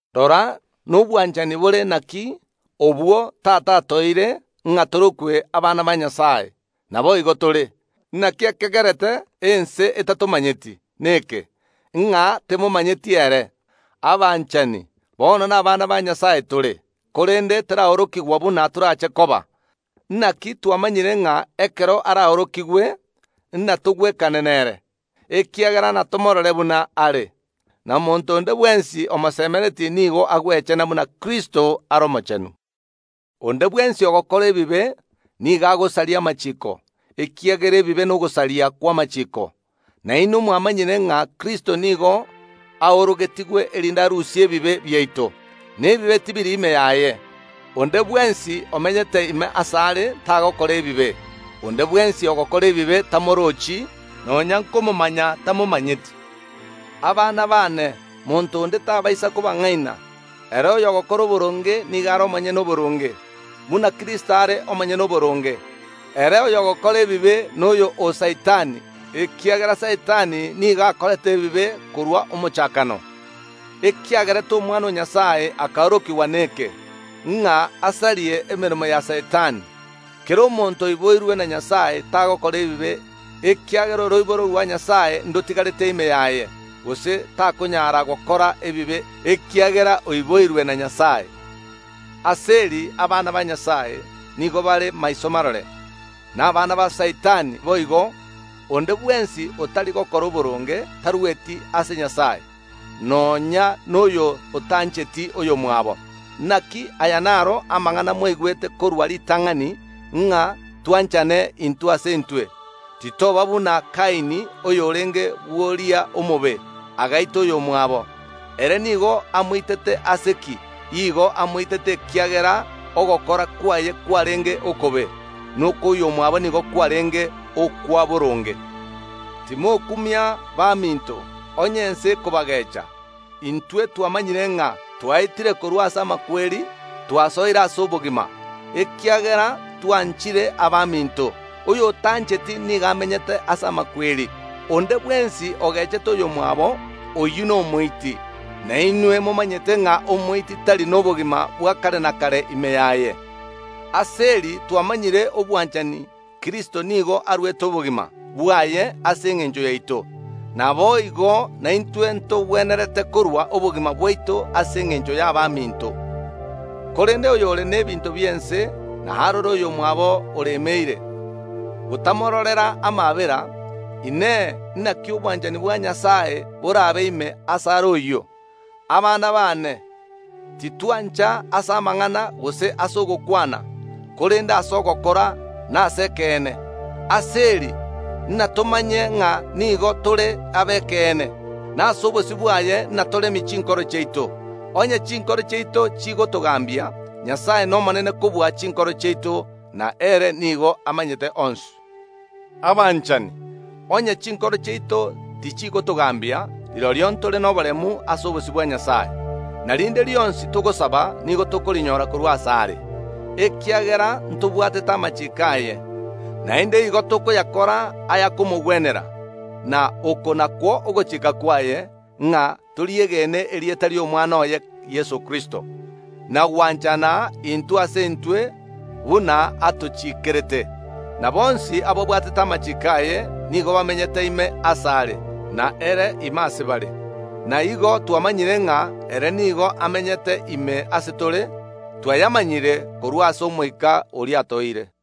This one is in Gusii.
Rora, nobwanchani bore naki, obwo Tata atoeire, ng’a torokwe abana ba Nyasae, na naboigo tore! Naki ekegerete ense etatomanyeti neke, ng’a temomanyeti Nyasae. Abanchani, bono nabana ba Nyasae tore, korende teraorokigwa buna torache koba. Naki twamanyire ng’a ekero araorokigwe ntogwekane nere, ekiagera natomoorore buna are. Na monto onde bwensi omosemeretie nigo agwechena buna Kristo are omochenu. Onde bwensi ogokora ebibe, nigo agosaria amachiiko, ekiagera ebibe nogosaria kw’amachiiko. Na inwe mwamanyire ng’a Kristo nigo aorogetigwe erinde arusie ebibe biaito, na bibe tibiri ime yaye. Onde bwensi omenyete ime asare tagokora ebibe; onde bwensi ogokora ebibe tamorochi, nonya nkomomanya tamomanyeti. Abana baane, monto onde tabaisa kobang’aina. Ere oyogokora oboronge nigo are omonyene oboronge, buna Kristo are omonyene oboronge. Ere oyogokora ebibe noyo o Saitani, ekiagera Saitani nigo akorete ebibe korwa omochakano. Ekiagerete Omwana o Nyasae akaorokigwa neke, ng’a asarie emeremo ya Saitani. Kera omonto oiboirwe na Nyasae tagokora ebibe, ekiagera oroiboro rwa Nyasae ndotigarete ime yaye, gose takonyara gokora ebibe, ekiagera oiboirwe na Nyasae. Ase eri abana ba Nyasae nigo bare maiso marore, na abana ba Saitani boigo: Onde bwensi otari gokora boronge tarueti ase Nyasae, nonya noyo otancheti oyomwabo. Naki aya naro amang’ana mwaigwete korwa ritang’ani, ng’a twanchane intwe ase intwe. Titoba buna Kaini, oyorenge bw’oria omobe, agaita oyomwabo. Ere nigo amoitete ase ki? Kaini nigo aitete oyomwabo ekiagera ogokora kwaye kwarenge okobe, na okw’oyomwabo nigo kwarenge okwa boronge. Timokumia, baminto, onye abanto b’ense bakobagecha. Intwe twamanyire ng’a twaetire korwa ase amakweri, twasoire ase obogima, ekiagera twanchire abaminto. Oyotancheti nigo amenyete ase amakweri. Onde bwensi ogechete oyomwabo oyio nomoiti, na inwe momanyete ng’a omoiti tari nobogima bwa kare na kare ime yaye. Ase eri twamanyire obwanchani: Kristo nigo aruete obogima bwaye ase engencho yaito. Naboigo naintwe ntogwenerete korua obogima bwaito ase engencho y’abaminto. Korende oyore n’ebinto bi’ense, na arore oyomwabo oremeire, gotamororera amaabera, Inee, naki obwanchani bwa Nyasae borabe ime asare oyio? Abana baane, titwancha ase amang’ana gose ase ogokwana, korende ase ogokora, na ase ekeene. Ase eri natomanye ng’a nigo tore ab’ekeene, na ase obosio bwaye natoremie chinkoro chiaito. Onye chinkoro chiaito chigotogambia, Nyasae nomonene kobua chinkoro chiaito, na ere nigo amanyete onsi. Abanchani, onye chinkoro chiaito tichigotogambia, rirorio ntore noboremu ase obosio bwa Nyasae, na rinde rionsi togosaba nigo tokorinyora korwa asare, ekiagera ntobwatete amachiiko aye, naende igo tokoyakora ayakomogwenera. Na oko nakwo ogochika kwaye, ng’a toriegene erieta ri’Omwana oye Yeso Kristo, na gwanchana intwe ase intwe buna atochiikerete. Na bonsi ababwatete amachiiko aye nigo bamenyete ime asare na ere ime ase bare. Na igo twamanyire ng’a ere nigo amenyete ime ase tore, twayamanyire korwa ase Omoika oria atoeire.